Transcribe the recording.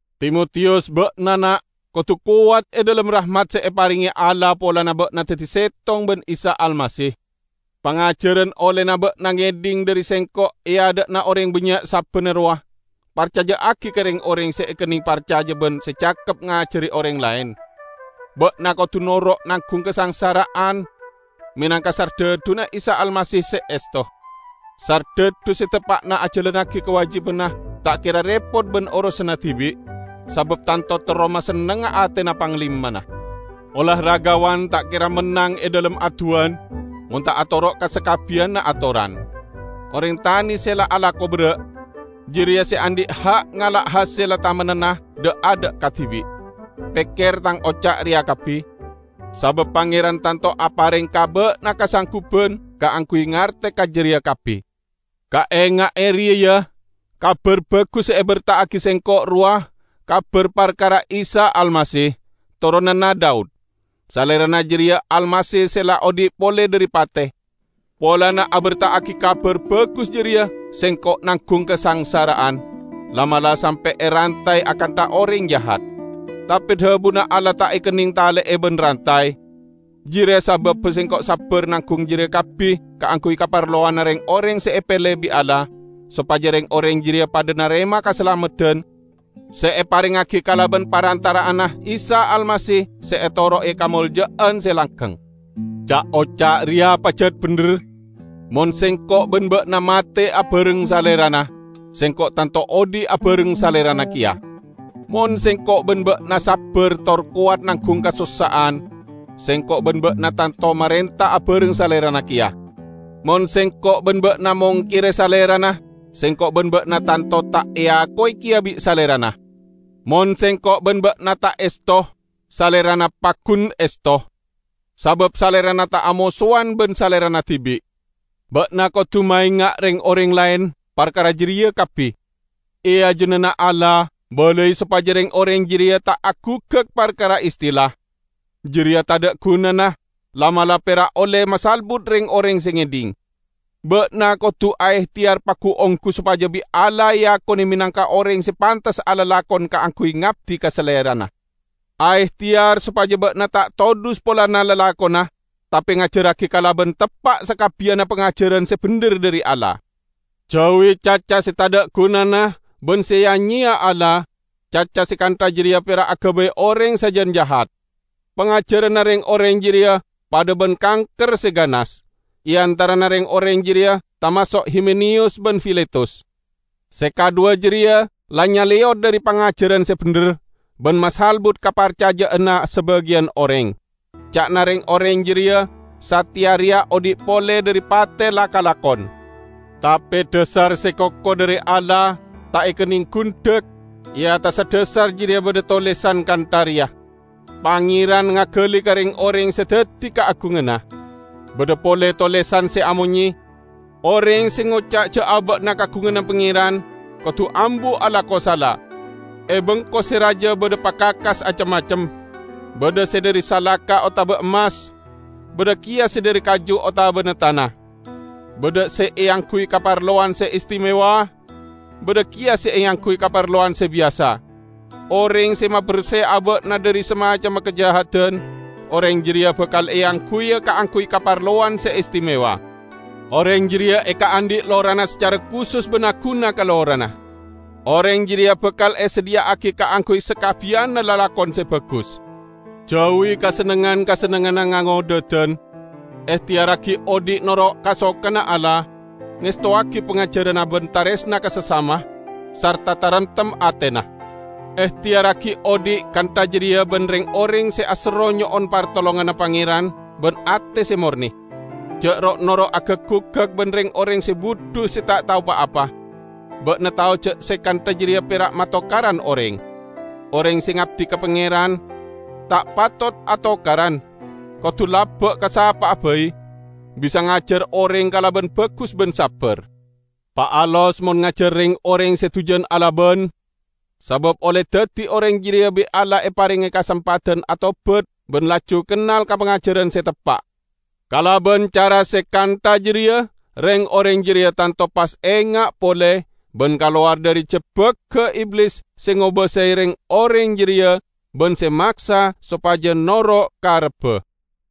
Timotiyus, ba'na na', kodu kowat e dhalem rahmat se eparenge Allah polana ba'na daddi settong ban Isa Almasih. Pangajaran ollena ba'na ngedhing dhari sengko' e adha'na oreng bannya' sabbanna rowa, parcaja'agi ka reng-oreng se ekenneng parcaja ban se cakep ngajari oreng laen. Ba'na kodu noro' nanggung kasangsara'an menangka sardhadhuna Isa Almasih se esto. Sardhadhu se teppa'na ajalannagi kawajibanna ta' kera repot ban orosanna dibi', sabab tanto terro masennengnga atena panglimana. Olahragawan ta' kera mennang e dhalem adduwan mon ta' atoro' ka sakabbiyanna atoran. Oreng tane se la alako berra', jareya se andhi' ha' ngala' hasella tamennanna dha'-adha' kadibi'. Pekker tang oca' reya kabbi, sabab Pangeran tanto apareng ka ba'na kasangguban kaangguy ngarte ka jareya kabbi. Kaenga'e reya, ya: Kabar Bagus se eberta'agi sengko' rowa kabar parkara Isa Almasih, toronanna Daud; Salerana jareya Almasih se la odhi' pole dhari pate. Polana aberta'agi Kabar Bagus jareya, sengko' nanggung kasangsara'an; la'-mala' sampe' erantay akantha oreng jahat. Tape dhabuna Allah ta' ekenneng tale'e ban rantay. Jareya sababba sengko' sabbar nanggung jareya kabbi kaangguy kaparlowanna reng-oreng se epele bi' Allah, sopaja reng-oreng jareya padha narema kasalameddan se eparengngagi kalaban parantara'anna Isa Almasih, se etoro'e kamolja'an se langgeng. Ca'-oca' reya pajat bendher: "Mon sengko' ban ba'na mate abareng Salerana, sengko' tanto odhi' abareng Salerana keya. Mon sengko' ban ba'na sabbar tor kowat nanggung kasossa'an, sengko' ban ba'na tanto marenta abareng Salerana keya. Mon sengko' ban ba'na mongkere Salerana, sengko' ban ba'na tanto ta' eako keya bi' Salerana. Mon sengko' ban ba'na ta' esto, Salerana paggun esto, sabab Salerana ta' amosowan ban Salerana dibi'." Ba'na kodu maenga' reng-oreng laen parkara jareya kabbi. E ajunanna Allah, balai sopaja reng-oreng jareya ta' aguggak parkara istilah. Jareya tadha' gunana, la'-mala' pera' olle masalbut reng-oreng se ngedhing. Ba'na kodu aehteyar pagu-onggu sopaja bi' Allah eakone menangka oreng se pantes alalakon kaangguy ngabdi ka Salerana. Aehteyar sopaja ba'na ta' todhus polana lalakonna, tape ngajarragi kalaban teppa' sakabbiyanna pangajaran se bendher dhari Allah. Jauwi caca se tadha' gunana ban se ya-nyeya Allah; caca se kantha jareya pera' agabay oreng sajan jahat. Pangajaranna reng-oreng jareya padha ban kanker se gahas. E antarana reng-oreng jareya tamaso' Himeneyus ban Filetus. Se kadhuwa jareya la nyaleyot dhari pangajaran se bendher, ban masalbut kaparcaja'anna sabagiyan oreng. Ca'na reng-oreng jareya sateya reya odhi' pole dhari pate la kalakon. Tape dhasar se koko dhari Allah ta' ekenneng gundhek; e attassa dhasar jareya badha tolesan kantha reya, "Pangeran ngagali ka reng-oreng se daddi kaagunganna." Badha pole tolesan se amonye, "Oreng se ngoca' ja' aba'na kaagunganna Pangeran, kodu ambu alako sala." E bengko se raja badha pakakas acem-macem. Badha se dhari salaka otaba emmas, badha keya se dhari kaju otabana tana. Badha se eangguy kaparlowan se istimewa, badha keya se eangguy kaparlowan se biyasa. Oreng se maberse aba'na dhari samacemma kajahadan, oreng jareya bakal eangguya kaangguy kaparlowan se istimewa. Oreng jareya ekaandhi' lorana sacara kusus ban aguna ka lorana. Oreng jareya bakal esadhiya'agi kaangguy sakabbiyanna lalakon se bagus. Jauwi kasennengngan-kasennengnganna ngangodhadan. Ehteyarragi odhi' noro' kasokanna Allah, ngestowagi pangajaranna ban taresna ka sasama, sarta taremtem atena. Ehteyarragi odhi' kantha jareya ban reng-oreng se aserro nyo'on partolonganna Pangeran ban ate se morne. Ja' ro'-noro' agak-guggak ban reng-oreng se budhu se ta' tao pa-apa. Ba'na tao ja' se kantha jareya pera' matokaran oreng. Oreng se ngabdi ka Pangeran ta' patot atokaran; kodu laba ka sapa'a bai, bisa ngajar oreng kalaban bagus ban sabbar. Paalos mon ngajar reng-oreng se dujan alaban; sabab olle daddi oreng jareya bi' Allah eparenge kasempadan atobat ban laju kennal ka pangajaran se teppa'. Kalaban cara se kantha jareya reng-oreng jareya tanto pas enga' pole, ban kalowar dhari jebbagga Iblis se ngobasae reng-oreng jareya ban se maksa sopaja noro' karebba.